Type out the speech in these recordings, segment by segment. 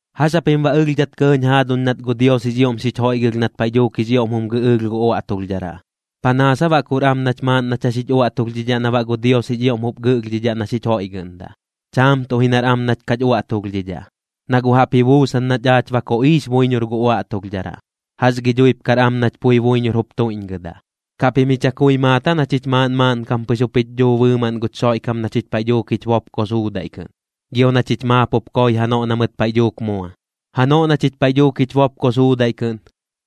¿Jax japim baꞌ ɨlhdhat kɇɇñ jaaduñ nat gu Dios jix ioꞌm xich joiꞌgɨlh nat paiꞌ dhuuk jix ioꞌm jum gɨꞌɨɨlh gu uaꞌtulhdharaꞌ? ¿Panaas aa baꞌ kur am nach maaꞌn nach jax jich uaꞌtulhdhidhaꞌ na baꞌ gu Dios jix ioꞌm jup gɨꞌlhdhidhaꞌ na xich joiꞌgɨꞌndaꞌ? Chaam tuꞌ ji nar am nach kach uaꞌtulhdhidhaꞌ, na guꞌ jaꞌp ji buusan nach aach ba koꞌiix buiñor gu uaꞌtulhdharaꞌ. ¿Jax gi dhuip kar am nach pui buiñor jup tuiꞌñgɨdaꞌ? ¿Kaꞌ pim ji chakui maat aa na chich maaꞌn maaꞌnkam pɨx jup jich dhuu bɨɨmaꞌn guch Xoiꞌkam na chich paiꞌ dhuuk jich bopko suudaiꞌ kɨꞌn, gio na chich maap jup koi janoꞌ na mɨt paiꞌ dhuuk mua? Janoꞌ na chich paiꞌ dhuuk jich bopko suudaiꞌ kɨꞌn,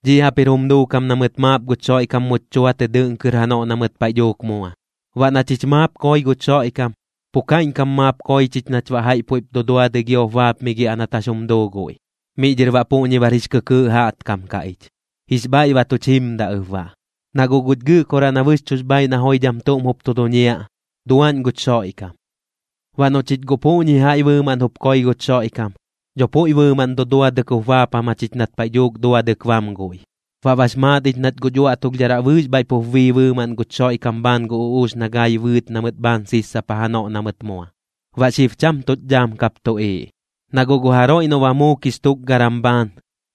dhiꞌ jaꞌp jir jum duukam na mɨt maap guch Xoiꞌkam much chua tɨ dɨꞌn kɨr janoꞌ na mɨt paiꞌ dhuuk mua. Baꞌ na chich maap koi guch Xoiꞌkam, pu kaiꞌñkam maap koi chich nach baꞌ jaiꞌ puiꞌp duduadɨi giop baapmigiaꞌ nat jax jum duu guiꞌ. Miꞌ dhɨr baꞌ puꞌñi bar jix kɨkɨɨꞌ jaꞌtkam kaꞌ ich, jix bhaiꞌ ba tuch jimdaꞌ ɨp baꞌ, na guꞌ guch Gɨꞌkoraꞌ na bɨxchuꞌx bhaaiꞌ na joidham tuꞌm jup tu duñiaꞌ, duaꞌñ guch Xoiꞌkam. Baꞌ noꞌ chich guꞌ puꞌñi jaiꞌ bɨɨmaꞌn jup koi guch Xoiꞌkam, dho puiꞌ bɨɨmaꞌn duduadɨk jup baapam jachich nat paiꞌ dhuuk duadɨk bam guiꞌ. Baꞌ bax maat ich nat guch uaꞌtulhdharaꞌ bɨɨx bhaiꞌ pup bii bɨɨmaꞌn guch Xoiꞌkam bhaan gu uꞌuux na gai bɨɨt na mɨt bhaan sissapa janoꞌ na mɨt mua, baꞌ xib cham tuꞌch dhaam kap tuꞌiiꞌ. Na guꞌ gu jaroiꞌ noꞌ ba muukix tukgaram bhaan,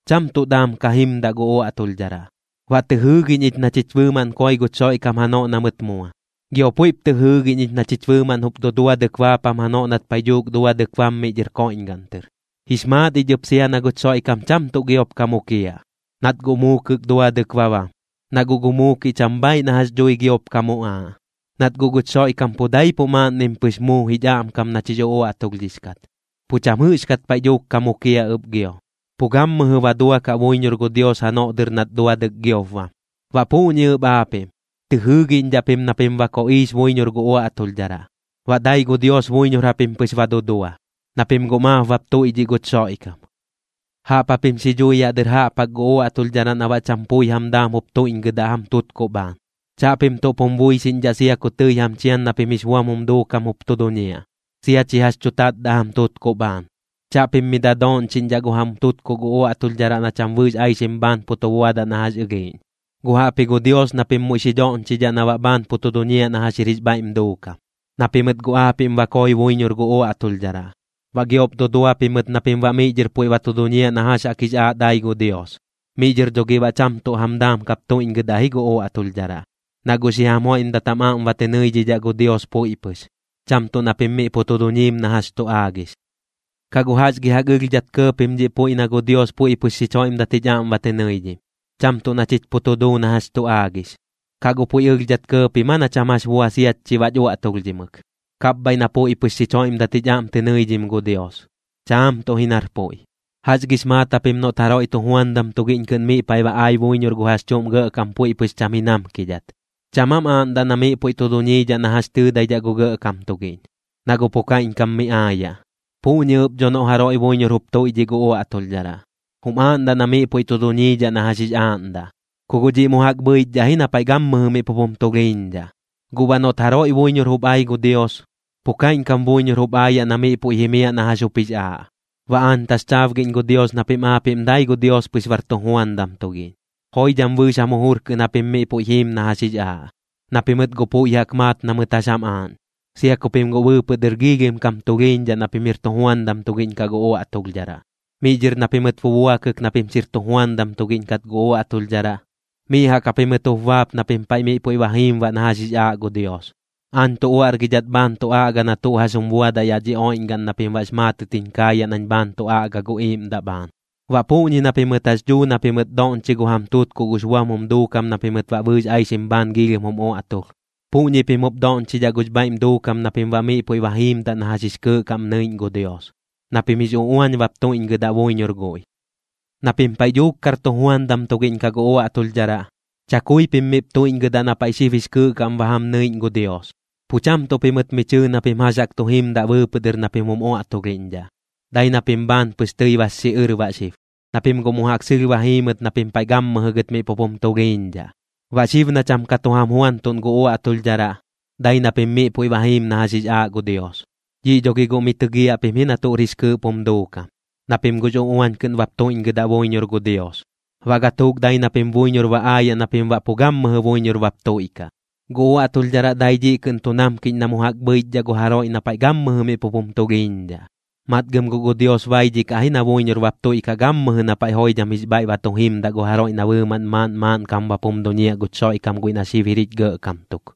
cham tuꞌ daam ka jimdaꞌ gu uaꞌtulhdharaꞌ. Baꞌ tɨ jɨɨgiꞌñ ich na chich bɨɨmaꞌn koi guch Xoiꞌkam janoꞌ na mɨt mua, gio puiꞌp tɨ jɨɨgiꞌñ ich na chich bɨɨmaꞌn jup duduadɨk baapam janoꞌ nat paiꞌ dhuuk duadɨk bam miꞌ dhɨr koiꞌñgaꞌn tɨr. Jix maat ich ɨp sia na guch Xoiꞌkam cham tuꞌ giop ka mukiaꞌ, nat guꞌ muukɨk duadɨk ba bam, na guꞌ gu muukiꞌ cham bhaaiꞌ na jax dhui giop ka muꞌaaꞌ. Nat guꞌ guch Xoiꞌkam pu daipuꞌ maaꞌnnim pɨx muu jich aꞌmkam nach jix uꞌuaꞌtulhdhix kat, pu cham jɨꞌxkat paiꞌ dhuuk ka mukiaꞌ ɨp gio, pu gammɨjɨ ba duakaꞌ buiñor gu Dios janoꞌ dɨr nat duadɨk giop bam. Baꞌ puꞌñi ɨp aapiꞌm, tɨ jɨɨgiꞌñdhaꞌ pim na pim ba koꞌiix buiñor gu uaꞌtulhdharaꞌ, baꞌ dai gu Dios buiñor japim pɨx ba dudua, na pim guꞌ maap bap tuiꞌdhiꞌ guch Xoiꞌkam. Jaꞌp japim xi dhui yaꞌ dɨr jaꞌp jaꞌk gu uaꞌtulhdharaꞌ na baꞌ cham pui jam daam jup tuiꞌñgɨdaꞌ jam tutkuꞌ bhaan. Chaꞌpim tuꞌp jum buixiꞌñdhaꞌ sia ku tɨi jam chian na pim jix buam jum duukam jup tu duñiaꞌ, sia chi jax chu tatdaꞌ jam tutkuꞌ bhaan. Chaꞌpim mi dadooꞌñchiꞌñdhaꞌ gu jam tutkuꞌ gu uaꞌtulhdharaꞌ na cham bɨɨx aixim bhaan pu tu buadaꞌ na jax ɨlhiiꞌñ, guꞌ jaꞌpji gu Dios na pim muiꞌ xi dhoꞌñchidhaꞌ na baꞌ bhaan pu tu duñiaꞌ na jax jir jix bhaiꞌm duukam. Na pimɨt guꞌ aapiꞌm ba koi buiñor gu uaꞌtulhdharaꞌ, baꞌ giop dudua pimɨt na pim baꞌ miꞌ dhɨr puiꞌ ba tu duñiaꞌ na jax jaꞌk jix aaꞌ dai gu Dios. Miꞌ dhɨr dho gi baꞌ guꞌ cham tuꞌ jam daam kap tuiꞌñgɨdaꞌ ji gu uaꞌtulhdharaꞌ, na guꞌ xi jam joiꞌmdat jam aꞌm ba tɨ nɨidhidhaꞌ gu Dios puiꞌ pɨx, cham tuꞌ na pim miꞌ pu tu duñiim na jax tu aagix. ¿Kaꞌ guꞌ jax gi jaꞌk ɨlhdhat kɇɇ pim dhiꞌ puiꞌ na gu Dios puiꞌ pɨx xich joiꞌmdat jich aꞌm ba tɨ nɨidhim, cham tuꞌ na chich pu tu duu na jax tu aagix? ¿Kaꞌ guꞌ puiꞌ ɨlhdhat kɇɇ pim aa na cham jax bua siach chi baꞌch uaꞌtulhdhimɨk, kapbhaiꞌ na puiꞌ pɨx xich joiꞌmdat jich aꞌm tɨ nɨidhim gu Dios? Chaam tuꞌ ji nar puiꞌ. ¿Jax gix maat japim noꞌt jaroiꞌ tujuandam tugiꞌñ kɨꞌn miꞌ paiꞌ ba ai buiñor gu jax chuꞌm gɇꞌkam puiꞌ pɨx cham ji namkidhat? ¿Cham aam aaꞌndaꞌ na miꞌ puiꞌ tu duñiidhaꞌ na jax tɨɨdaidhaꞌ gu gɇꞌkam tugiꞌñ, na guꞌ pu kaiꞌñkam mi aayaꞌ? Puꞌñi ɨp dho noꞌ jaroiꞌ buiñor jup tuiꞌdhiꞌ gu uaꞌtulhdharaꞌ, jum aaꞌndaꞌ na miꞌ puiꞌ tu duñiidhaꞌ na jax jix aaꞌndaꞌ, ku guꞌ dhiꞌ mu jaꞌk bhɨichdhaꞌ ji na paiꞌ gammɨjɨ miꞌ pup jum tulhiiñdhaꞌ. Guꞌ baꞌ noꞌt jaroi buiñor jup ai gu Dios, pu kaiꞌñkam buiñor jup aayaꞌ na miꞌ puiꞌ jimiaꞌ na jax jup jix aaꞌ. Baꞌ aañ taxchaabgiꞌñ gu Dios na pim aapiꞌm dai gu Dios pɨx bar tujuandam tugiꞌñ, joidham bɨɨx jam jujur kɨꞌn japim miꞌ puiꞌ jiim na jax jix aaꞌ, na pimɨt guꞌ puiꞌ jaꞌk maat na mɨt jax jam aaꞌñ, sia ku pim guꞌ bɨɨpɨꞌ dɨr giilhim kam tulhiiñdhaꞌ na pim jir tujuandam tugiꞌñ kaꞌ gu uaꞌtulhdharaꞌ. Miꞌ dhɨr na pimɨt bubuakɨk na pim xir tujuandam tugiꞌñ kat gu uaꞌtulhdharaꞌ, miꞌ jaꞌk japimɨt jup baap na pim paiꞌ miꞌ puiꞌ ba jiim baꞌ na jax jix aaꞌ gu Dios. Aañ tu uaꞌrgidhat bhaan tu aꞌga na tuꞌ jax jum buadaꞌ yaꞌ dhi oiꞌñgaꞌn na pim baꞌx maatɨt jiñ kaayaꞌ nañ bhaan tu aꞌga gu iiꞌmdaꞌ bhaan. Baꞌ puꞌñi na pimɨt jax dhuu na pimɨt doꞌñchi gu jam tutkuꞌ gux buam jum duukam na pimɨt baꞌ bɨɨx aixim bhaan giilhim jum uaꞌtulh, puꞌñi pim jup doꞌñchidhaꞌ gux bhaiꞌm duukam na pim baꞌ miꞌ puiꞌ ba jiimdaꞌ na jax jix kɨɨꞌ kaꞌm nɨiꞌñ gu Dios, na pim jix uꞌuañ bap tuiꞌñgɨdaꞌ buiñor guiꞌ. Na pim paiꞌ dhuuk kar tujuandam tugiꞌñ kaꞌ gu uaꞌtulhdharaꞌ, chakui pim miꞌp tuiꞌñgɨdaꞌ na paiꞌ xib jix kɨɨꞌ kaꞌm ba jam nɨiꞌñ gu Dios. Pu cham tuꞌ pimɨt mi chɨɨ na pim jax jaꞌk tu jimdat bɨɨpɨꞌ dɨr na pim jum uaꞌtulhiꞌñdhaꞌ, dai na pim bhaan pɨx tɨi bax xiꞌɨr baꞌ xib, na pim guꞌ mu jaꞌk sɨlh ba jiimɨt na pim paiꞌ gammɨjɨ gɨt miꞌ pup jum tulhiiñdhaꞌ. Baꞌ xib na cham ka tu jam juantuꞌn gu uaꞌtulhdharaꞌ, dai na pim miꞌ puiꞌ ba jiim na jax jix aaꞌ gu Dios. Dhiꞌ dho gi guꞌ mi tɨgiaꞌ pim ji na tuꞌr jix kɨɨꞌp jum duukam, na pim guꞌx uꞌuañ kɨꞌn bap tuiꞌñgɨdaꞌ buiñor gu Dios, baꞌ gatuuk dai na pim buiñor ba aayaꞌ na pim baꞌ pu gammɨjɨ buiñor bap tuiꞌkaꞌ. Gu uaꞌtulhdharaꞌ dai dhiꞌ kɨꞌn tu namkiꞌñ na mu jaꞌk bhɨichdhaꞌ gu jaroiꞌ na paiꞌ gammɨjɨ miꞌ pup jum tulhiiñdhaꞌ. Matgɨm guꞌ gu Dios baidhikaꞌ ji na buiñor bap tuiꞌkaꞌ gammɨjɨ na paiꞌ joidham jix bhaiꞌ ba tu jimdaꞌ gu jaroiꞌ na bɨɨmaꞌn maaꞌn maaꞌnkam bap jum duñiaꞌ guch Xoiꞌkam guiꞌ na xib jir jich Gɇꞌkam tuk.